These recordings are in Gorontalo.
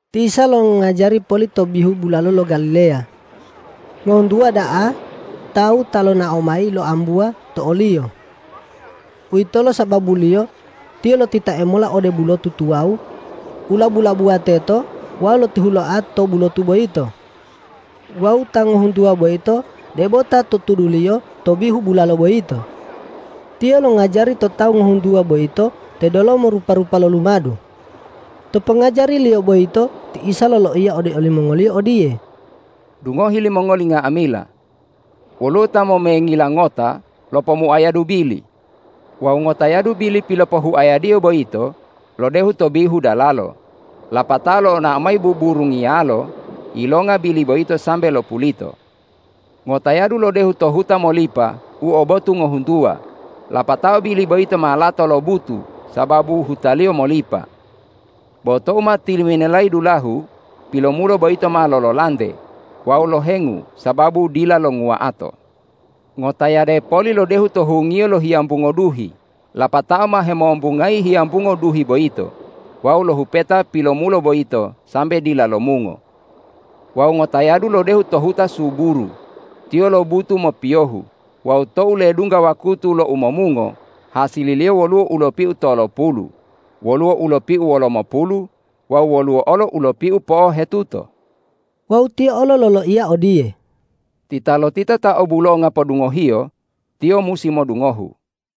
Ti Isa longajari poli to bihu bulalo lo Galileya. Ngohuntuwa da'a tawu ta lonao mayi loambuwa to o-Liyo. Uwitolo sababuliyo Tiyo lotitae mola ode bulotu tuwawu u labu-labuwa teto wawu lotihuloa to bulotu boyito. Wawu tawu ngohuntuwa boyito debo ta to tuduliyo to bihu bulalo boyito. Tiyo longajari to tawu ngohuntuwa boyito to delomo rupa-rupa lo lumadu. To pongajari-Liyo boyito ti Isa loloiya ode olimongoliyo odiye, ”Dungohi limongoli nga'amila! Woluwo ta momengila ngota lopomuayadu bili. Wawu ngotayadu bili pilopohuayadiyo boyito lodehu to bihu dalalo, lapatao lonao mayi buburungiyalo yilonga bili boyito sambe lopulito. Ngotayadu lodehu to huta molipa u o botu ngohuntuwa, lapatao bili boyito ma lato lobutu sababu hutaliyo molipa. Bo tou ma tiliminelayi dulahu, pilomulo boyito ma lololante wawu lohengu sababu dila longuwa'ato. Ngotayade poli lodehu to hungiyo lo hiyambungo duhi, lapatao ma hemombungayi hiyambungo duhi boyito wawu lohupeta pilomulo boyito sambe dila lomungo. Wawu ngotayadu lodehu to huta suburu. Tiyo lobutu mopiyohu wawu tou ledungga wakutu lo umomungo, hasililiyo woluwo u lopiu tolopulu, woluwo u lopiu wolomopulu wawu woluwo olo u lopiu po'ohetuto.” Wawu Tiyo olo loloiya odiye,”Titalotita ta obulonga podungohiyo, tiyo musi modungohu!”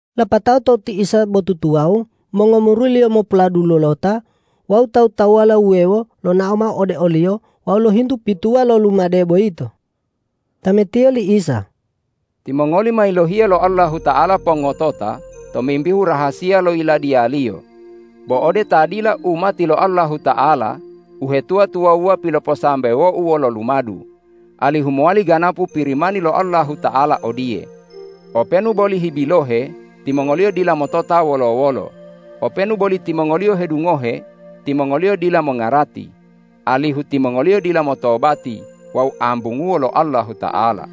Lapatao tou ti Isa bo tutuwawu, mongomuri-Liyo mopuladulota wawu tawu-tawuwala wuwewo lonao mao ode o-Liyo wawu lohintu pituwa lo lumade boyito. Tametiyo li Isa,”Timongoli ma yilohiya lo Allahuta'ala pongotota tomimbihu rahasiya lo Yiladiya-Liyo, bo ode ta dila umati lo Allahuta'ala uhetuwa-tuwawuwa piloposambewo-U wolo lumadu alihu mowali ganapu Pirimani lo Allahuta'ala odiye, ’Openu boli hibilohe, timongoliyo dila motota wolo-wolo; openu boli timongoliyo hedungohe, timongoliyo dila mongarati, alihu timongoliyo dila motobati wawu ambunguwo lo Allahuta'ala.’”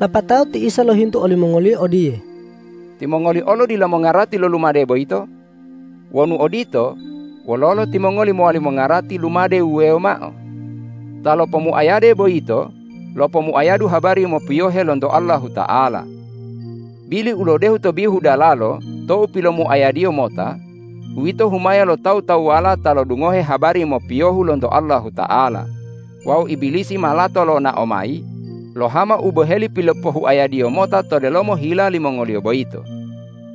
Lapatao ti Isa lohintu olimongoliyo odiye,”Timongoli olo dila mongarati lo lumade boyito? Wonu odito, wololo timongoli mowali mongarati lumade wuwewo mao? Ta lopomuayade boyito lopomuayadu habari mopiyohe lonto Allahuta'ala. Bili u lodehu to bihu dalalo tou pilomuayadiyo mota, uwito humaya lo tawu-tawuwala ta lodungohe habari mopiyohu lonto Allahuta'ala wawu Ibilisi ma lato lonao mayi lohama u boheli pilopohuayadiyo mota to delomo hila limongoliyo boyito.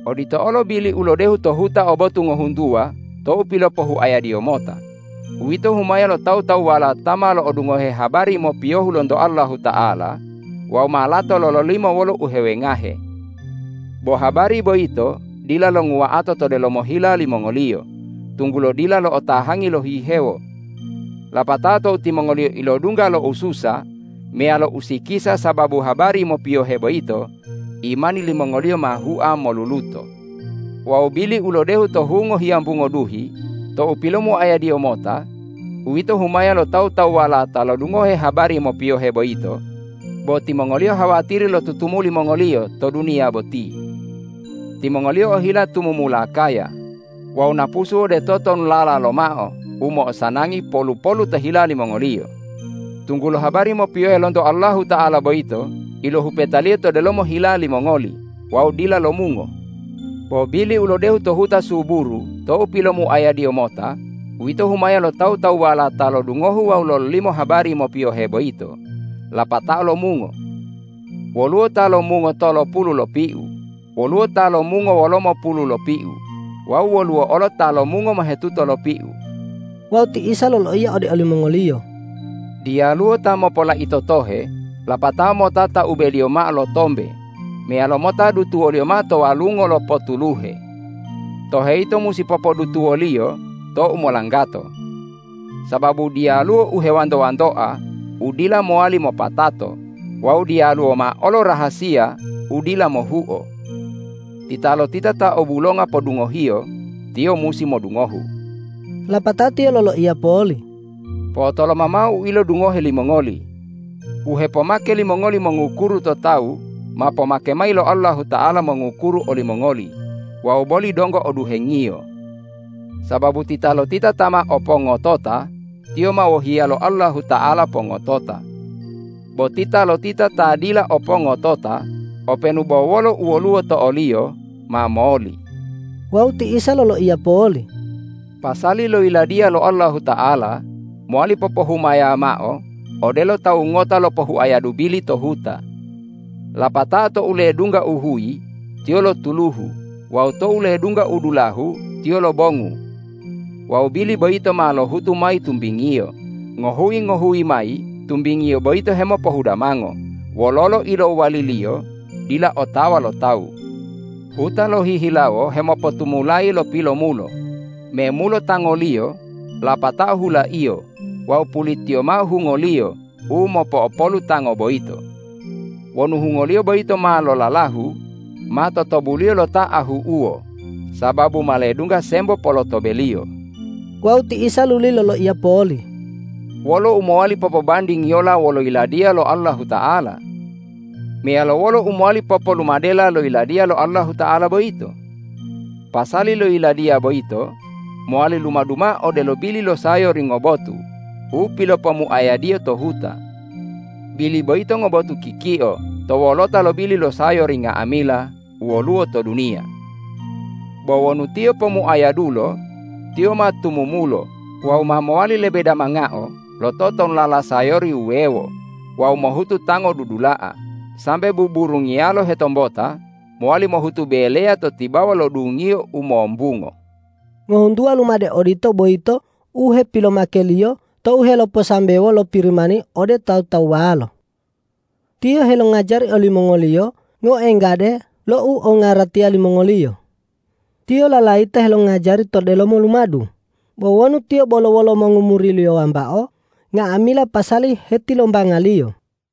Odito olo bili u lodehu to huta o botu ngohuntuwa tou pilopohuayadiyo mota, uwito humaya lo tawu-tawuwala ta ma lo'odungohe habari mopiyohu lonto Allahuta'ala wawu ma lato lololimo wolo uhewengahe. Bo habari boyito dila longuwa'ato to delomo hila limongoliyo, tunggulo dila lo'otahangi lohihewo. Lapatao tou timongoliyo ilodungga lo ususa meyalo usikisa sababu habari mopiyohe boyito, imani limongoliyo ma hua moluluto. Wawu bili u lodehu to hungo hiyambungo duhi tou pilomuayadiyo mota, uwito humaya lo tawu-tawuwala ta lodungohe habari mopiyohe boyito, bo timongoliyo hawatiri lo tutumuli mongoliyo to duniya boti. Timongoliyo ohila tumumula kaya wawu napusu ode totonulala lomao u mo'osanangi polu-polu to hila limongoliyo, tunggulo habari mopiyohe lonto Allahuta'ala boyito ilohupetaliyo to delomo hila limongoli wawu dila lomungo. Bo bili u lodehu to huta suburu tou pilomuayadiyo mota, uwito humaya lo tawu-tawuwala ta lodungohu wawu lololimo habari mopiyohe boyito lapatao lomungo. Woluwo ta lomungo tolopulu lopiu, woluwo ta lomungo wolomopulu lopiu wawu woluwo olo ta lomungo mohetuto lopiu.” Wawu ti Isa loloiya ode olimongoliyo,”Diyaluwo ta mopolaito tohe, lapatao mota taubeliyo mao lo tombe meyalo mota dutuwoliyo mao to walungo lo potuluhe. Tohe yito musi popodutuwoliyo to u molanggato. Sababu diyaluwo u hewanto-wantoa u dila mowali mopatato wawu diyaluwo mao olo rahasiya u dila mohuo. Titalotita ta o bulonga podungohiyo, tiyo musi modungohu!” Lapatao Tiyo loloiya poli,”Po'otoloma mao u ilodungohe limongoli! U hepomake limongoli mongukuru to tawu ma pomake mayi lo Allahuta'ala mongukuru olimongoli wawu boli donggo o duhengiyo. Sababu titalotita ta ma o pongotota, tiyo ma wohiya lo Allahuta'ala pongotota. Bo titalotita ta dila o pongotota, openu bo wolo u woluwo to oliyo ma moli.” Wawu ti Isa loloiya poli,”Pasali lo Yiladiya lo Allahuta'ala mowali popohumaya mao odelo tawu ngota lopohuayadu bili to huta. Lapatao tou ledungga uhuyi tiyo lotuluhu wawu tou ledungga u dulahu tiyo lobongu. Wawu bili boyito ma lohutu mayi tumbingiyo, ngohuyi-ngohuyi mayi tumbingiyo boyito hemopohudamango, wololo ilowaliliyo dila otawa lo tawu. Huta lohihilawo hemopotumulayi lo pilomulo, memulo tangoliyo lapatao hulaiyo wawu pulitiyo mao hungoliyo u mopo'opolu tango boyito. Wonu hungoliyo boyito ma lolalahu, ma totobuliyo lo ta ahu'uwo, sababu ma ledungga sembo polotobeliyo.” Wawu ti Isa luli loloiya poli,”Wolo u mowali popobandingiyola wolo Yiladiya lo Allahuta'ala? Meyalo wolo u mowali popolumadela lo Yiladiya lo Allahuta'ala boyito? Pasali lo Yiladiya boyito mowali lumadu mao odelo bili lo sayori ngobotu u pilopomuayadiyo to huta. Bili boyito ngobotu kikio to wolota lo bili lo sayori nga'amila u woluwo to duniya. Bo wonu tiyo pomuayadulo, tiyo ma tumumulo wawu ma mowali lebe damangao lo totonulala sayori wuwewo wawu mohutu tango dudula'a, sambe buburungiyalo hetombota mowali mohutu beleya to tibawa lo dungiyo u mombungo.” Ngohuntuwa lumade odito boyito u hepilomake-Liyo tou heloposambewo lo Pirimani ode tawu-tawuwalo. Tiyo helongajari olimongoliyo ngoenggade lo u ongaratiya limongoliyo. Tiyo lalayita helongajari to delomo lumadu, bo wonu Tiyo bolo wolo mongomuri-Liyo wambao, nga'amila pasali hetilombanga-Liyo.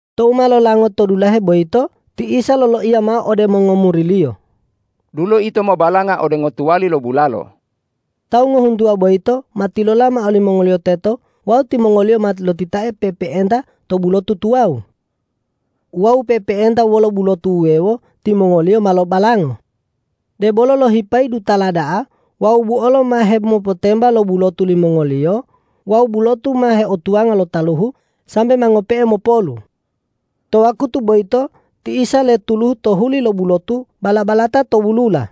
Tou ma lolango to dulahe boyito ti Isa loloiya mao ode mongomuri-Liyo,”Dulo ito mobalanga ode ngotuwali lo bulalo.” Tawu ngohuntuwa boyito ma tilola mao limongoliyo teto wawu timongoliyo ma lotitae pe'epe'enta to bulotu tuwawu. Wawu pe'epe'enta wolo bulotu wuwewo timongoliyo ma lobalango. Debolo lohipayi dutala da'a wawu buolo ma hemopotemba lo bulotu limongoliyo wawu bulotu ma heotuwanga lo taluhu, sambe ma ngope'e mopolu. To wakutu boyito ti Isa letuluhu to huli lo bulotu bala-balata to wulula.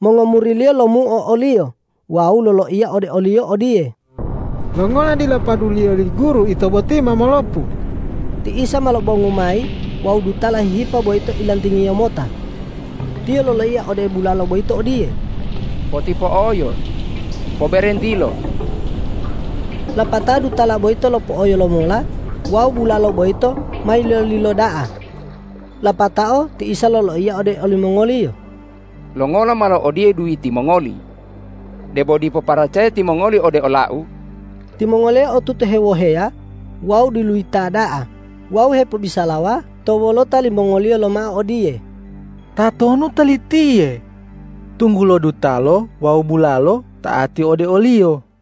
Mongomuri-Liyo lomuo o-Liyo wawu loloiya ode o-Liyo odiye,”Longola dila paduliyo li Guru ito boti ma molopu?” Ti Isa ma lobongu mayi wawu dutala hihipa boyito ilantingiyo mota. Tiyo loloiya ode bulalo boyito odiye,”Potipo'oyo! Poberentilo!” Lapatao dutala boyito lopo'oyo lomola wawu bulalo boyito ma yilolilo da'a. Lapatao ti Isa loloiya ode olimongoliyo,”Longola malo odiye duyiti mongoli? Debo dipo paracaya timongoli ode ola-U?” Timongoliyo otutu hewoheya wawu diluyita da'a wawu hipobisalawa to wolota limongoliyo lomao odiye,”Tatonu Talitiye, tunggulo dutalo wawu bulalo ta'ati ode o-Liyo?”